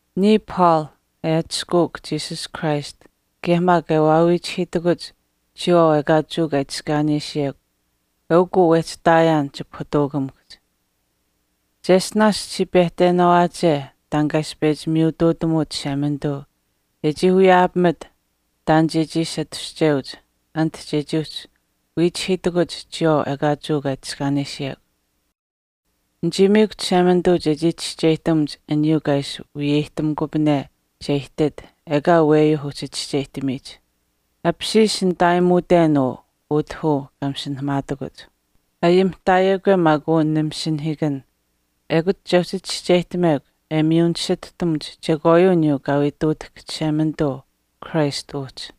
Niya Paul, e atushkuuk Jesus Christ kaye maak e waawiichihiitakuch chiyawaau ekaa Jewa kaa itiskaanesiyekw eukuu wehchi ihtaayaan chipahutuukamikuhch. Cheshtinaash chichii pehtenaawaache taan kaa ishi pechi miyutuutamuut Chishemanituu e chii wiyaapamit taan chechii ishi atushcheuch anit chechii uhchi wiichihiitakuch chiyawaau ekaa Jewa kaa itiskaanesiyekw. Nichii miikw Chishemanituu chechii chischeyihtamuch aniyuu kaa ishi wiyeyihtamukupane che ihtit ekaa aweyuuh uhchi chischeyihtamiyich. Apishiish nitaayimuuten uu utah uu kaa masinahamaatakuch. Ayimihtaayekwe maak uu nimasinahiikan ekut che uhchi chischeyihtamekw e miyu nisituhtamuch chekwaayuu aniyuu kaa wii ihtuutahk Chishemanituu Christ uhchi.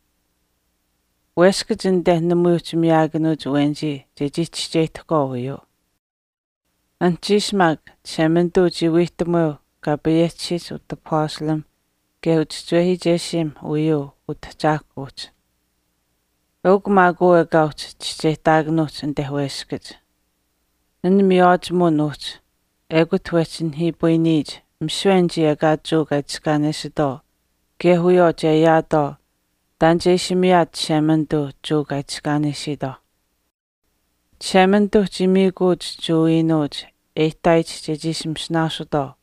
Weskach anite namui uhchi miyaakanuuch awenichii chechii chischeyihtahkwaau uyuu. Anuhchiish maak Chishemanituu chii wiihtamuweu kaa payehchisiyich utapastalimh kaye uchischiwehiichesiimh uyuu Utahchaahkwa uhchi. Eukw maak uu ekaa uhchi chischeyihtaakunuuhch anite weskach, An miywaachimuwin uhchi ekut wehchi nihiipayiniyich misiwe anichii ekaa Jewa kaa itiskaanesitwaau kaye wiyawaau che ayaatwaau taan che ishi miyaat Chishemanituu aniyuuh Jewa kaa itiskaanesiitwaauh. Chishemanituuh chii miikuuch Jewa iinuuch e ihtaayich chechii ishi masinaasutwaau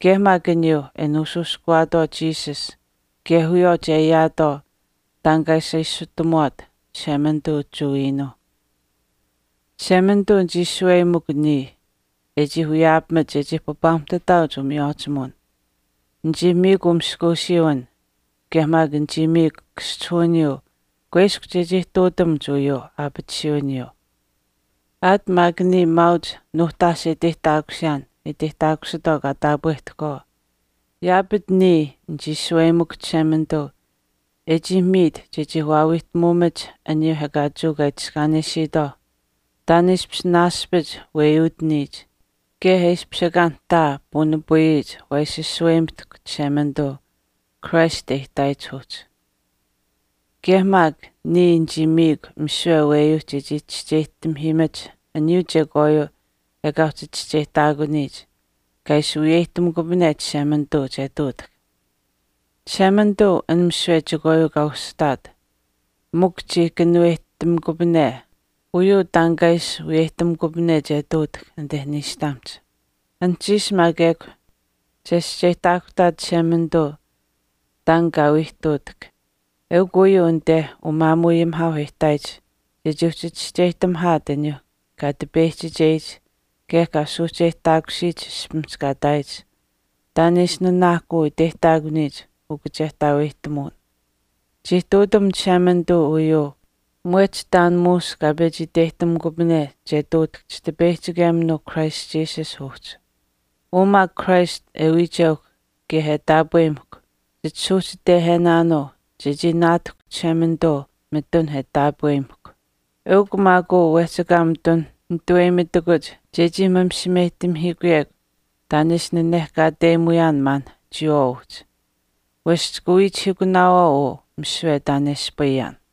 kaye maak aniyuu e nuushuushkuwaatwaau Jesus kaye wiyawaau che ayaataau taan kaa ishi ashutamuwaat Chishemanituu Jewa iinuuh. Chishemanituu nichii shaweyimikw niya e chii wiyaapamit chechii papaamuhtataauch umiywaachimuwin, nichii miikw umaskuusiiwin kaye maak nichii miikw kaschihuwiniyuu kuiskw chechii ihtuutamuch uyuu aapatisuwiniyuu. Aat maak niya maauch nuuhtaash e iteyihtaakusiyaan e iteyihtaakusitwaau kaa taapwehtahkwaau, yaapach niya nichii shaweyimikw Chishemanituu e chii miit chechii waawiihtamuumach aniyuuh ekaa Jewa kaa itiskaanesiitwaauh taan e ishpish naaspich weyuutaniyich kaye e ishpish ekaa nihtaa puunipayiyich taan waa ishi shaweyimitahkw Chishemanituu Christ e ihtaayich uhchi. Kaye maak, niya nichii miikw misiwe aweyuuh chechii chischeyihtamihiimach aniyuu chekwaayuu ekaa uhchi chischeyihtaakuniyich kaa ishi wiyeyihtamikupane Chishemanituu che ihtuutahk. Chishemanituu an misiwe chekwaayuu kaa ushihtaat chii kanuweyihtamikupane mikw uyuu taan kaa ishi wiyeyihtamikupane che ihtuutahk anite niishtamihch. Anuhchiish maak ekw chescheyihtaakuhtaat Chishemanituu taan kaa wii ihtuutahk, eukw uyuu anite umaamuuayimihaauh e ihtaayich chechii uhchi chischeyihtamihaat aniyuu kaa tipeyihchicheyich kaye kaa suuhcheyihtaakusiyich ishpimihch kaa ihtaayich taan e ishi nanaahkuu iteyihtaakuniyich ukachehtaaweyihtamuwin. Chii ihtuutam Chishemanituu uyuu mwehch taan muush kaa pechi iteyihtamikupane che ihtuutahk Chitipeyihchikeminuu Christ Jesus uhchi. Uu maak Christ e wiicheuhkw kaye e taapweyimahkw chisuuhchitehenaanuu chechii naatahkw Chishemanituu mitun e taapweyimahkw. Eukw maak uu wehchi ekaa mitun nituweyimitakuch chechii misimeyihtamihiikuyekw taan e ishi nanehkaateyimuyaan maanh chiyawaau uhchi, wesh chika wiichihiikunaawaau uu misiwe taan e ispayaan.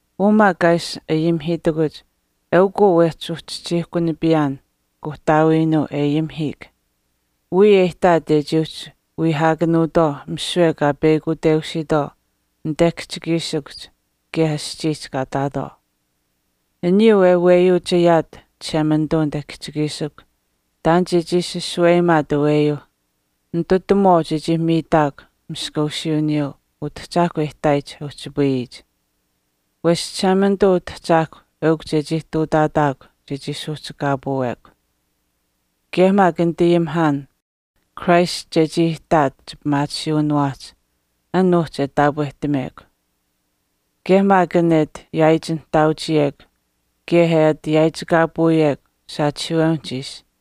Uu maak kaa ishi ayimihiitakuch eukuu wehchi uchihchiihkunipiyaan Kuuhtaawiinuu e ayimihiik, wiya e ihtaat e chii uhchi wiihaakanuutwaau misiwe kaa peyakuteusiitwaau anite kihchikiishikuhch kaye aschiihch kaa ihtaatwaau. Aniyuu e weyuuch ayaat Chishemanituu anite kihchikiishikuhch taan chechii ishi shaweyimaat aweyuuh ninitutamuwaau chechii miitaakw maskuusiiwiniyuu Utahchaahkwa e ihtaayich e uhchipayiyich. Wesh Chishemanituu Utahchaahkwa eukw chechii ihtuutaataakw chechii suuhchikaapuwekw. Kaye maak nitayimihaan, Christ chechii ihtaat chipimaatisiiwiniwaahch an uhchi e taapwehtamekw. Kaye maak an e ati yaaichinihtaauchiyekw kaye e ati yaaichikaapuuyekw saachihiiwewinihch ishi,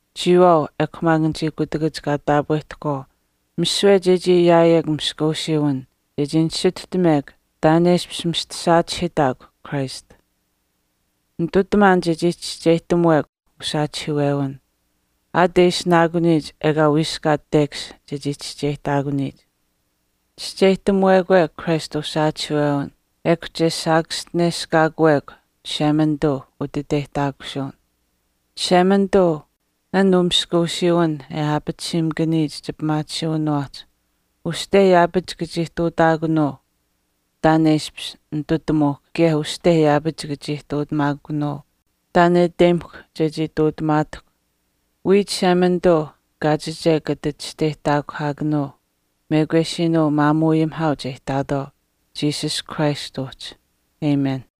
chiyawaau ekw maak anichii kutakach kaa taapwehtahkwaau misiwe chechii ayaayekw maskuusiiwin chechii nisituhtamekw taan e ishpish mista saachihiitahkw Christ. Nitutamaan chechii chischeyihtamuwekw usaachihiiwewin, aat e ishinaakuniyich ekaa wiiskaat tekash chechii chischeyihtaakuniyich. Chischeyihtamuwekwe Christ usaachihiiwewin ekw che saakaschineshkaakuwekw Chishemanituu utiteyihtaakusuwin. Chishemanituu, an umaskuusiiwin e aapatisiimakaniyich chipimaatisiiwinaahch uste yaapach chika chii ihtuutamaakunuu taan e ishpish nitutamuuhkw kaye uste yaapach chika chii ihtuutamaakunuu taan e iteyimahkw chechii ihtuutamaatahkw. Wiya Chishemanituu kaachiche kata chisteyihtaakuhaakanuu mekwesiinuu umaamuuayimihaauh e ihtaayitwaauh Jesus Christ uhchi. Amen.